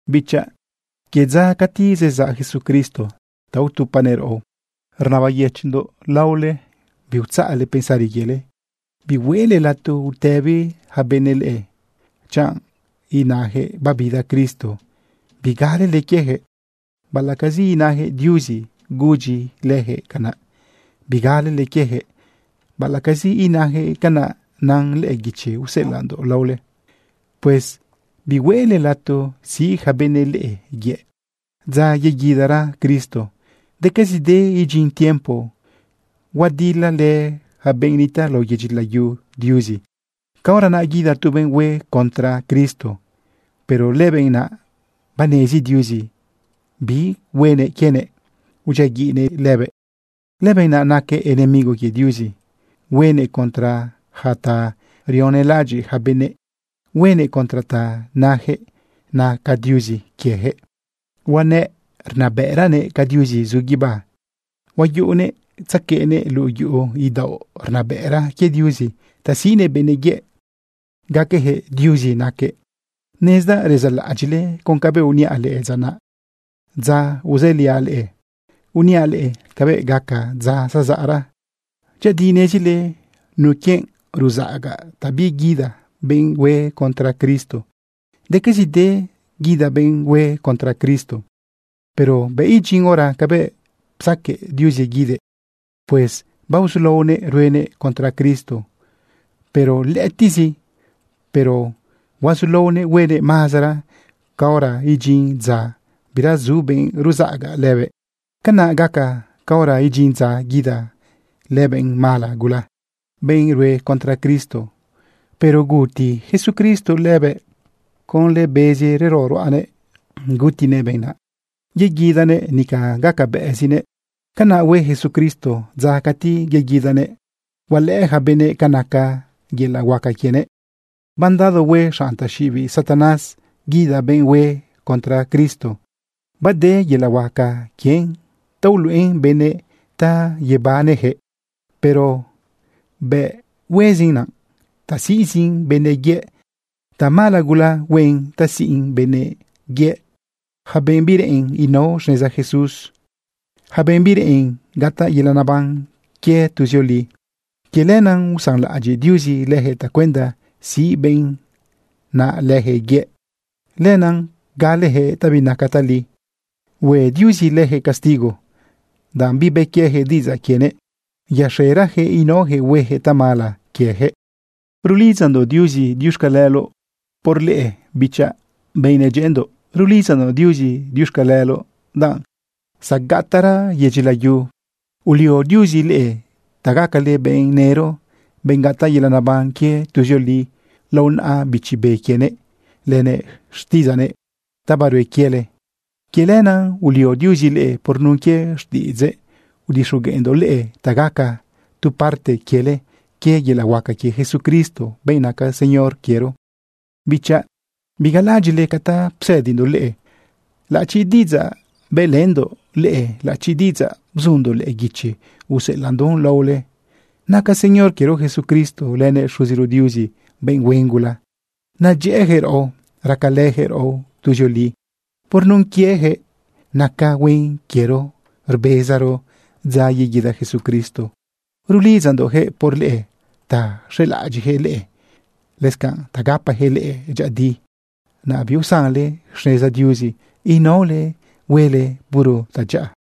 Bichaꞌ, quie dza cati zezaꞌ Jesucristo ta utupanëꞌ raꞌo, rnabayëchiꞌndoꞌ leꞌe biutzaꞌle pensari quiele bihueꞌle lato utëbi yaca benëꞌ leꞌe, chanꞌ nayaquëꞌ babida Cristo. Bigalele quieyaquëꞌ baꞌalaꞌcazi inajëꞌ Diuzi gudyi lëjëꞌ canaꞌ. Bigalele quieyaquëꞌ baꞌalaꞌcazi inayaquëꞌ canaꞌ nan lëꞌë guichi useꞌelaꞌndoꞌ laole. Pues bihueꞌle lato siꞌ yaca benëꞌ leꞌe yëꞌ. Dza yeguidara Cristo, decazide idyin tiempo huadilalë ja benꞌ nitaꞌ lao yedyi layu Diuzi. Caora naꞌ guida tu benꞌ hue contra Cristo. Pero lëbenꞌ naꞌ, banezi Diuzi bi huenëꞌ quienëꞌ, udyiaguiꞌnëꞌ lëbëꞌ. Lëbenꞌ naꞌ naquëꞌ enemigo quie Diuzi. Huenëꞌ contra yaca ta rionelaꞌadyiꞌ yaca benëꞌ, huenëꞌ contra ta najëꞌ naca diuzi quiejëꞌ. Huanëꞌ rnabëꞌranëꞌ ca Diuzi zu guibá. Huayuꞌunëꞌ tzaqueꞌnëꞌ luꞌu yuꞌu idaoꞌ rnabëꞌra quie Diuzi ta siꞌnëꞌ benëꞌ yëꞌ gaqueyaquëꞌ Diuzi naquëꞌ. Nezdaꞌ rezalaꞌadyiꞌle con cabëꞌ uniaꞌ leꞌe dza naꞌ, dza uzëliaꞌ leꞌe uniaꞌ leꞌe cabëꞌ gaca dza zazaꞌra. Dyëꞌëdi nezile nuquienꞌ ruzaꞌaga ta biguida benꞌ hue contra Cristo. Decazide guida benꞌ hue contra Cristo, pero bëꞌ idyin hora cabëꞌ psaquëꞌ Diuzi guidëꞌ. Pues baozulaonëꞌ ruenëꞌ contra Cristo, pero lëꞌëtiꞌzi. Pero huazulaonëꞌ huenëꞌ mazara caora idyin dza bira zu benꞌ ruzaꞌaga lëbëꞌ. Canaꞌ gaca caora idyin dza guida lëbenꞌ mala gula, benꞌ rue contra Cristo. Pero guti Jesucristo lëbëꞌ. Conlë bezi rero ruꞌanëꞌ gutinëꞌ benꞌ naꞌ, yeguidanëꞌ nica gacabëꞌzinëꞌ. Canaꞌ hue Jesucristo dza cati yeguidanëꞌ hualëꞌë yaca benëꞌ ca naca yelaꞌ huaca quienëꞌ. Mandado hue xanꞌ taxiꞌibiꞌ Satanás guida benꞌ hue contra Cristo. Bade yelaꞌ huaca quien ta uluꞌen benëꞌ ta yebaneyaquëꞌ, pero bëꞌ huezin naꞌ ta siꞌzin benëꞌ yëꞌ. Tamala gula huen ta siꞌn benëꞌ yëꞌ, yaca benꞌ bireꞌen inao xneza Jesús, yaca benꞌ bireꞌen gataꞌ yelaꞌ neban quie tuzioli. Quie lenaꞌ usanlaꞌadyiꞌ Diuzi leyaquëꞌ tacuenda siꞌ benꞌ naꞌ lëjëꞌ yëꞌ. Lenaꞌ galeyaquëꞌ ta binaca tali. Hue Diuzi lëjëꞌ castigo, danꞌ bibë quieyaquëꞌ diꞌidzaꞌ quienëꞌ, yaxerayaquëꞌ inaoyaquëꞌ hueyaquëꞌ tamala quiejëꞌ. Rulidzandoꞌ Diuzi diuxcaleloꞌ por leꞌe, bichaꞌ, benꞌ nedyëꞌëndoꞌ. Rulidzandoꞌ Diuzi diuxcaleloꞌ, danꞌ zagataꞌra yedyi layu, ulio Diuzi leꞌe ta gacale benꞌ nëro, benꞌ gataꞌ yelaꞌ neban quie tuzioli lao naꞌa Bichi Be quienëꞌ lënëꞌ xtiꞌidzaꞌnëꞌ ta barue quiele. Quie lenaꞌ ulio Diuzi leꞌe por nun quie xtiꞌidzëꞌ udixogueꞌndoꞌ leꞌe ta gaca tu parte quiele quie yelaꞌ huaca quie Jesucristo, benꞌ naca Señor quiero. Bichaꞌ, bigalaꞌadyiꞌle ca ta psëdindoꞌ leꞌe, laꞌachi diꞌidzaꞌ bëꞌlëndoꞌ leꞌe, laꞌachi diꞌidzaꞌ bzundoꞌ lëꞌë guichi useꞌelaꞌndoꞌn laole. Naca Señor quiero Jesucristo lënëꞌ Xuziro Diuzi benꞌ huen gula, nedyëꞌëyaquëꞌ raꞌo, racalëyaquëꞌ raꞌo tuzioli. Por nun quieyaquëꞌ naca huen quiero rbezaro dza yeguida Jesucristo. Rulidzandoꞌyaquëꞌ por leꞌe ta xelaꞌadyiꞌyaquëꞌ leꞌe, lëscanꞌ ta gapayaquëꞌ leꞌe dyëꞌëdi, naꞌ biusanle xneza Diuzi inaole huele puro tadyaꞌa.